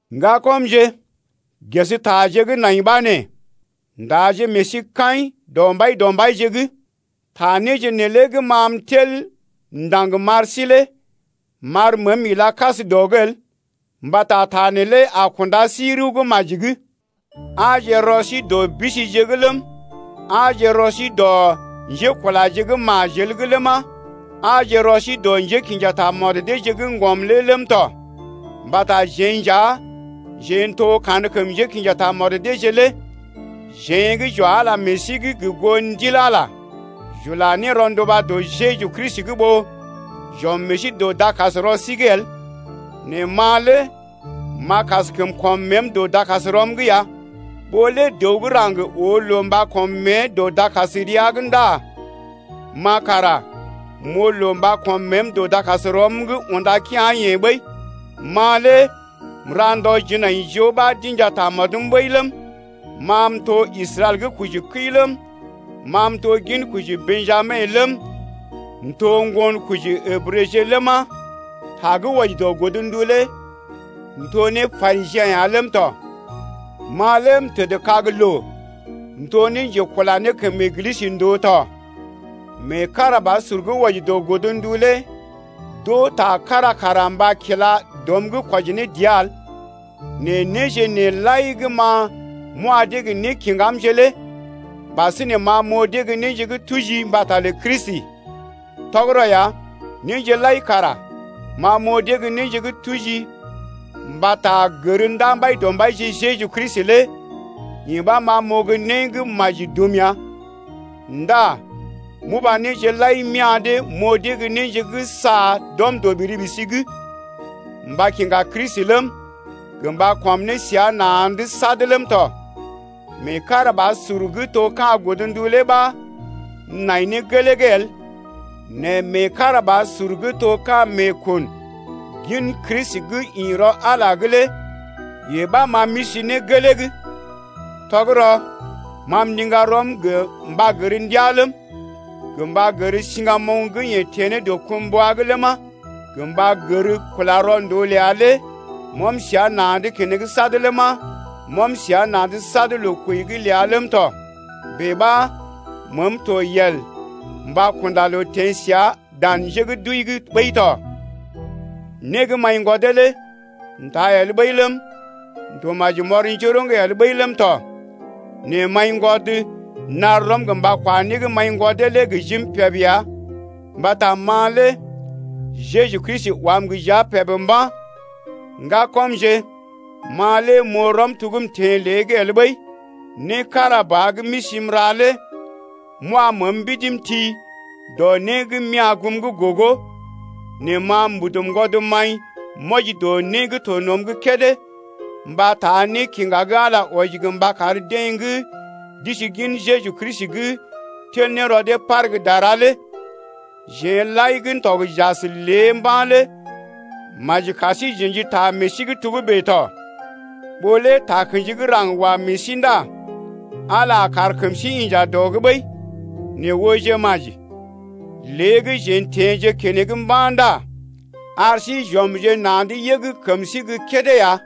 Ŋgakɔmje, ges taje gə́ nai ɓa nee: Ndaje meḛ sí kaḭ dɔ Mbaidɔmbaije’g. Ta néje neelé gə́ ma m’tel m’ndaŋg m’ar sí lé m’ar məəm ila kas dɔ’g el mbata ta neelé a kunda sí rəw gə́ maji’g. Aaje rɔ sí dɔ bisije’g ləm, aaje rɔ sí dɔ njékulaje gə́ majel’g ləma, aaje rɔ sí dɔ njékḭja tamɔd deeje gə́ ŋgɔm lé ləm tɔ. Mbata jeḛ nja jeḛ n’to kankəm njékḭja tamɔd deeje lé jeḛ gə́ j’wa Ala meḛ sí’g gə goo Ndil Ala lé, j’ula ne rɔnduba dɔ Jeju Kristi’g ɓó j’ɔm meḛ sí dɔ dakasrɔ sí’g el. Nɛ ma lé m’a kaskəm kɔm məəm dɔ dakasrɔm’g ya. Ɓó lé dəw gə́ raŋg oo loo mba kɔm mée dɔ dakasrea’g ndá ma kara m’oo loo mba kɔm məəm dɔ dakasrɔm’g unda kea̰-yeḛ ɓəi. Ma lé m’ra ndɔ jinaijoo ɓa d’inja tamɔdəm ɓəi ləm, ma m’to Israɛl gə́ kojikəi ləm, ma m’to ginkoji Bḛjami ləm, m’to ŋgonkoji Ǝbrəje ləma, ta gə́ wɔji dɔ godndu lé m’to ne Parisiḛ ya ləm tɔ. Ma lé m’tədkag loo m’to ne njekula ne kəm Eglisə ndòo tɔ. Meekarabasur gə́ wɔji dɔ godndu lé d’oo ta kára kara mba kila dɔm’g kwɔji ne dəa el. Nɛ néje nee lai gə́ ma m’wa dee gə́ nékiŋgamje lé ɓasinè ma m’oo dee gə́ néje gə́ tuji mbata lə Kristi. Tɔgərɔ ya, néje lai kara ma m’oo dee gə́ néje gə́ tuji mbata gər ndaa Mbaidɔmbaije Jeju Kristi lé yee ɓa ma m’oo gə́ né gə́ maji dum ya ndá m’uba néje lai m’ya̰ dee m’oo dee ne gə́ néje gə́ sa d’ɔm dɔ ɓiri-ɓisi’g, mba kiŋga Kristi ləm, gə mba kɔm ne səa na̰’d sad ləm tɔ. Meekarabasur gə́ to ka̰ godndu lé ɓa m’nai ne gelee’g el nɛ meekarabasur gə́ to ka̰ meekun gin Kristi gə́ ḭ rɔ Ala’g lé yee ɓa ma m’isi ne gelee’g. Tɔgərɔ ma m’ndiŋga rɔm gə mba gər ndəaa ləm, gə mba gər siŋgamoŋ gə́ yeḛ teḛ ne dɔkumbwa’g ləma, gə mba gər kula rɔ ndòo ləa lé m’ɔm səa na̰’d keneŋ sad ləma, m’ɔm səa na̰’d sad loo kwəi’g ləa ləm tɔ bèe ɓa məəm to yel mba kunda loo teḛ səa dan njé gə́ d’wəi’g ɓəi tɔ. Né gə́ m’aḭgwɔdee lé m’taa el ɓəi ləm, m’to maji m’ɔr njoroŋ el ɓəi ləm tɔ, nɛ m’aiŋgwɔd m’nar rɔm mba kwa né gə́ m’aḭgwɔdee lé gə jim peb ya mbata ma lé Jeju Kristi wam gə jia peb mba̰. Ŋgakɔmje, ma lé m’oo rɔm to gə́ m’teḛ lée’g el ɓəi: né kára ba gə́ m’isi m’ra lé m’wa məəm mbidi m’ti dɔ né gə́ m’ya̰ goom’g gogo, nɛ ma mbudu ŋgwɔd m’aḭ m’wɔji dɔ né gə́ to nɔm’g kédé mba taa nékiŋga gə́ Ala lé wɔji mba kar deḛ gə́ d’isi gin Jeju Kristi’g tel ne rɔ dee par gə́ dara lé. Jeḛ lai gə́ n’tɔg j’as lé mba̰ lé maji kar sí j’ə̰ji ta meḛ sí’g togə́bè tɔ, ɓó lé takə̰ji gə́ raŋg wa meḛ sí ndá Ala a kar kəm sí inja dɔ’g ɓəi. Nɛ ooje maji, lé gə́ jeḛ n’teḛje keneŋ mba̰ ndá ar sí j’ɔmje na̰’d yəg kəm sí gə́ kédé ya.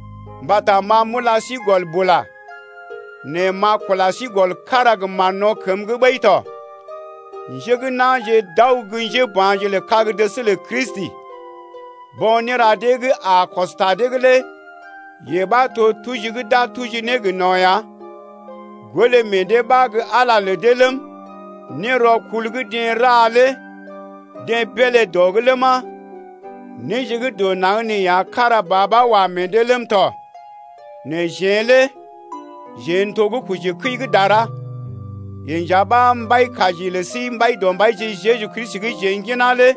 Mbata ma m’ula sí gɔl bula, nɛ m’a kula sí gɔl kára gə mán-no̰ kəm’g ɓəi tɔ, njé gə́ na̰je d’aw gə́ njéba̰je lə kag-dəs lə Kristi. Bo̰ néra dee gə́ a kɔs ta dee’g lé yee ɓa to tuji gə́ d’a tuji ne gə no̰ ya. Golé meḛ dee ɓa gə́ Ala lə dee ləm, nérɔkul gə́ deḛ ra lé deḛ beelé dɔ’g ləma, néje gə́ dɔ naŋg ya kára ba ɓa wa meḛ dee ləm tɔ. Nɛ jeḛ lé jeḛ n’to gə́ kojikəi gə́ dara, yee nja ɓa Mbaikaji lə sí Mbaidɔmbaije Jeju Kristi gə́ jeḛ ŋginá lé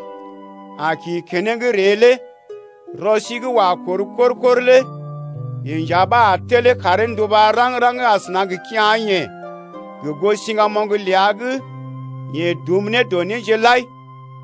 a kḭ keneŋ ree lé. Rɔ sí gə́ wa kor kor-kor lé yeḛ nja ɓa a telee karee nduba raŋg-raŋg asəna gə kea̰-yeḛ gə goo siŋgamoŋ ləa gə́ yeḛ dum ne dɔ néje lai lé ya.